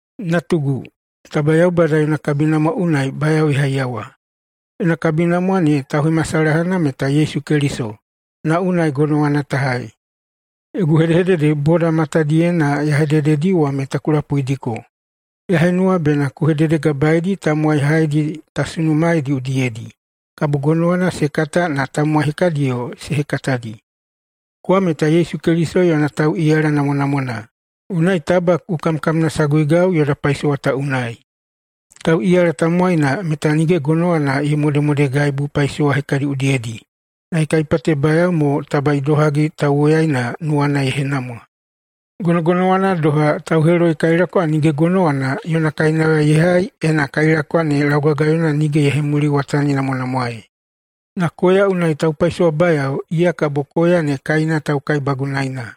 Natugu, taba Yaubada yona kabinamwa unai bayao ye haiyawa. Yona kabinamwa ne tauhemasalahana meta Yesu Keliso, na unai gonowana ta hai. Yogu hedehedede boda matadiyena ya hedededi wa meta ku lapuidiko. Ya henuwa bena ku hededegabaeidi tamowai haedi ta sunumaeidi udiyedi, kabo gonowana se kata na tamowai hekadiyo se hekatadi. Kowa meta Yesu Keliso yona tauꞌiyala namwanamwana, unai taba ku kamkamnasaguigau yoda paisowa ta unai. Tauꞌiyala tamowaina meta nige gonowana ye modemodegaibu paisowa hekadi udiyedi, na ye kaipatebayao mo taba idohagi tauwoyaina nuwana ye henamwa. Gonogonowana doha, tauheloikailakwa nige gonowana yona kainauya ye hai ena kailakwa ne laugagayona nige ye hemuliwataninamwanamwaei. Na koya unai taupaisowabayao, iya kabo koya ne kaina taukaibagunaina.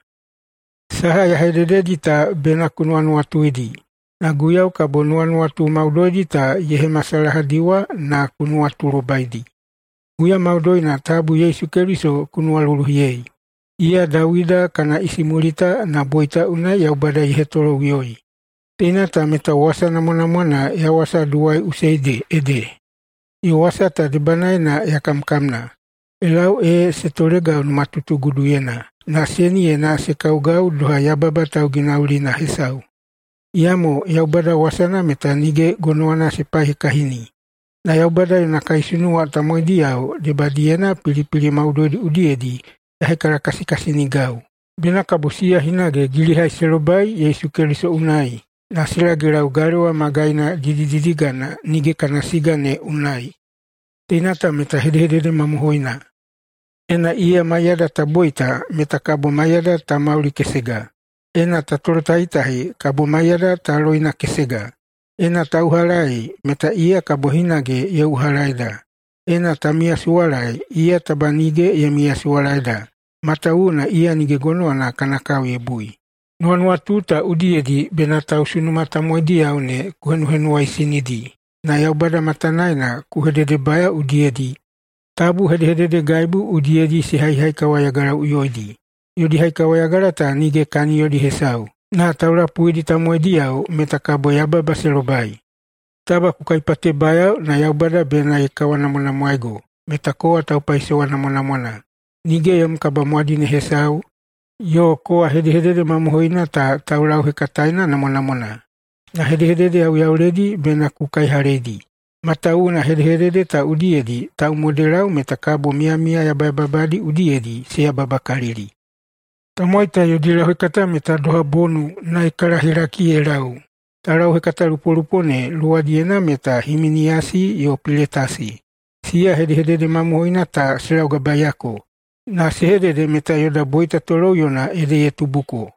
Saha ya hedededi ta bena ku nuwanuwatuidi, na Guiyau kabo nuwanuwatu maudoidi ta ye hemasalahadiwa na ku nuwatulobaidi. Huya maudoina tabu Yesu Keliso ku nuwaluluhiyei, iya Dawida kana isimulita na boita unai Yaubada ye hetoloꞌuyoi. Teina ta meta wasa namwanamwana ya wasaduwaiꞌusei ede, yo wasa ta debanaena ya kamkamna ye lau ee se tolegau numatutuguduyena na seniyena se kaugau doha yababa tauginaginaulina hesau. Iyamo Yaubada wasana meta nige gonowana se paihekahini. Na Yaubada yona kaisunuwa tamowaidiyao debadiyena pilipili maudoidi udiyedi ya hekalakasikasinigau, bena kabo siya hinage gilihai se lobai Yesu Keliso unai na se lagelau galewa magaina didididigana nige kana siga ne unai. Teina ta meta hedehedede mamohoina: “Ena iya maiyada ta boita, meta kabo maiyada ta maulikesega; ena ta tolotahitahi, kabo maiyada ta loinakesega. Ena ta uhalaei, meta iya kabo hinage ye uhalaeida; ena ta miyasuwalaei, iya taba nige ye miyasuwalaeda, matawuwuna iya nige gonowana kana kao ye bui.” Nuwanuwatu ta udiyedi bena tausunuma tamowaidiyao ne ku henuhenuwaisinidi na Yaubada matanaena ku hededebayao udiyedi tabu hedehededegaibu udiyedi se haihaikawayagalaꞌuyoidi. Yodi haikawayagala ta nige kaniyodi hesau, na taulapuidi tamowaidiyao meta kabo yababa se lobai. Taba ku kaipatebayao na Yaubada bena ye kawanamwanamwaego meta kowa taupaisowa namwanamwana, nige yom kabamwadine hesau, yo kowa hedehedede mamohoina ta taulauhekataena namwanamwana. Na hedehedede yauyauledi bena ku kaihaleidi. Matawuwuna hedehedede ta udiyedi taumodelau meta kabo miyamiya yabayababadi udiyedi se yababakalili. Tamowai ta yodi lauhekata meta doha bonu na ye kalahelaki ye lau. Taulauhekatalupolupo ne luwadiyena meta Himiniyasi yo Piletasi, siya hedehedede mamohoina ta se laugabaeyako, na se hedede meta yoda boita toloꞌuyona ede ye tubuko.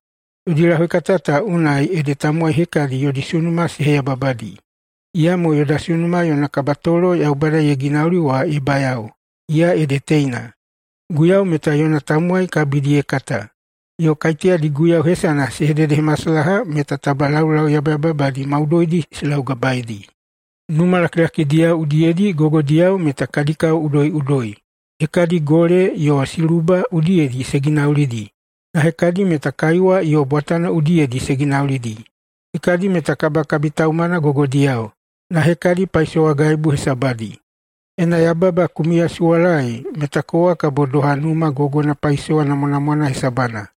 Yodi lauhekata ta unai ede tamowai hekadi yodi sunuma se heyababadi. Iyamo yoda sunuma yona kabatolo Yaubada ye ginauli wa ye bayao, iya ede teina: “Guiyau meta yona tamowai kabidi ye kata”, yo, “Kaiteyadi Guiyau hesana se hededehemasalaha meta taba laulau yabayababadi maudoidi se laugabaeidi.” Numa lakilakidiyao udiyedi gogodiyao meta kadi kao udoiꞌudoi. Hekadi gole yo siluba udiyedi se ginaulidi, na hekadi meta kaiwa yo bwatano udiyedi se ginaulidi. Hekadi meta kabakabitaumana gogodiyao, na hekadi paisowagaibu hesabadi. Ena yababa ku miyasuwalaei, meta kowa kabo doha numa gogona paisowa namwanamwana hesabana.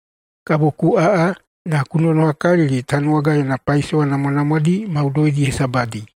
Kabo ku aꞌa na ku nonohakalili Tanuwaga yona paisowa namwanamwadi maudoidi hesabadi.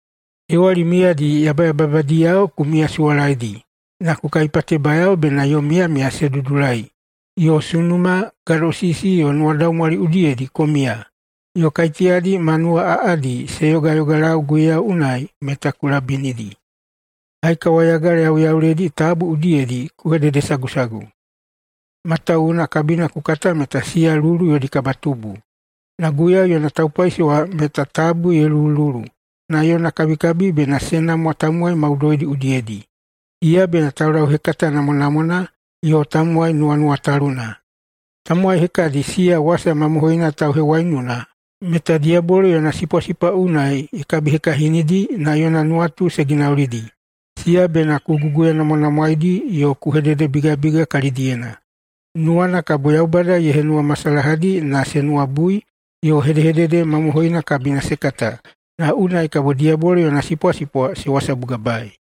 Hewali miyadi yabayababadiyao ku miyasuwalaedi, na ku kaipatebayao bena yom miyamiya se dudulai, yo sunuma, gadosisi, yo nuwadaumwali udiyedi ku miya. Yo kaiteyadi ma nuwaꞌaꞌadi se yogayogalau Guiyau unai meta ku labinidi. Haikawayagala yauyauledi tabu udiyedi ku hededesagusagu, matawuwuna kabina ku kata meta siya lulu yodi kabatubu. Na Guiyau yona taupaisowa meta tabu ye lulululu, na yona kabikabi bena se namwa tamowai maudoidi udiyedi. Iya bena taulauhekata namwanamwana yo tamowai nuwanuwataluna. Tamowai hekadi siya wasa mamohoina tauhewaiununa meta diyabolo yona sipwasipwa unai ye kabihekahinidi na yona nuwatu se ginaulidi. Siya bena ku guguyanamwanamwaedi yo ku hededebigabiga kalidiyena. Nuwana kabo Yaubada ye henuwamasalahadi na se nuwabui yo hedehedede mamohoina kabina se kata, na unai kabo diyabolo yona sipwasipwa se wasabugabaei.